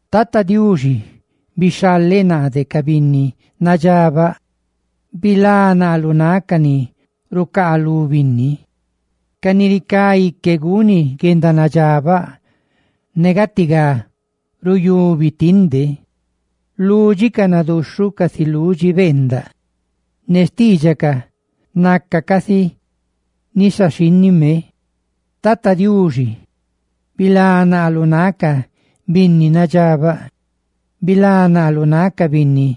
Tata Diuxi, bixhaleꞌ naa de ca binni nadxabaꞌ; bilá naa lu náꞌ ca ni rucaalú binni, ca ni ricá ique guni guedanadxabaꞌ ne gatigá ruyubi tinde. Lúdxicaꞌ naduxhuꞌ, casi ludxi beendaꞌ; ne xtiidxacaꞌ naca casi nisa xhínnime. Tata Diuxi, bilá naa lu náꞌ ca binni nadxabaꞌ, bilá naa lu náꞌ ca ni rucaalú binni,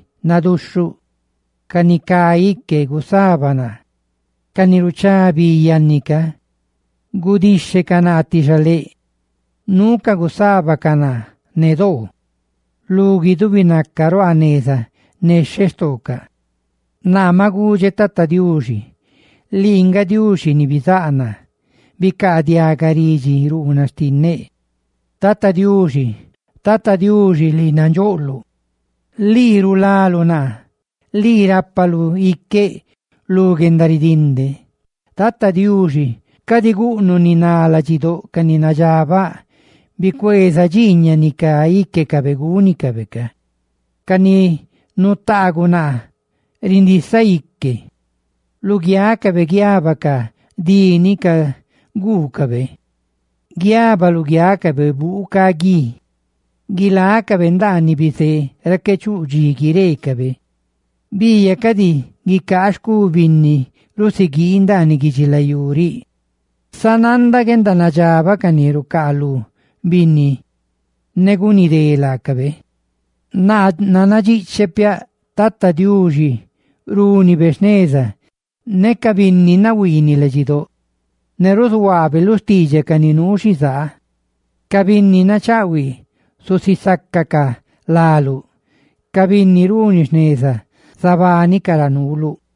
ca ni cá ique gusaba naa. Ca ni ruchá bi yanni ca gudixhecaꞌ naa ti xaléꞌ; nuucaꞌ gusábacaꞌ naa lu guixhe ne xtoocaꞌ; lu guidubi ruaa neza nexheꞌ xtoocaꞌ. Naa maꞌ gudxeꞌ Tata Diuxi: «Lii nga Diuxi ni bizáꞌ naa; ¡bicaadiaga laꞌ, ridxiruunaꞌ xtinneꞌ! Tata Diuxi, Tata Diuxi, ni nandxóꞌ ne rulá naa, lii rulaluꞌ iqueꞌ lu guendaridinde.» Tata Diuxi, cadi guꞌnuꞌ ni ná ladxidóꞌ ca ni nadxabaꞌ; bicueeza dxiiñaꞌ ni cá íquecabe gúnicabe. Ca ni nutaaguꞌ naa rindisa íquecaꞌ; ¡lugiácabe guiaba ca dí ni caguucabe! Guiaba buu ca gui luguiácabe; guilácabe ndaaniꞌ bizé ra qué chuꞌ dxi guireecabe. Biiyaꞌ cadi guicaa xcú binni rusiguii ndaaniꞌ guidxilayú riꞌ; sá nanda guendanadxabaꞌ ca ni rucaalú binni ne guni dé laacabe. Naa nannadxiꞌcheꞌ piaꞌ Tata Diuxi rúnibe jneza ne ca binni chibáꞌ ne ruzuhuaabe lu xtiidxaꞌ ca ni nuu xizaa. Ca binni nachaꞌhuiꞌ zusisácacaꞌ láluꞌ; ¡ca binni runi jneza zabánicaꞌ ra nuuluꞌ!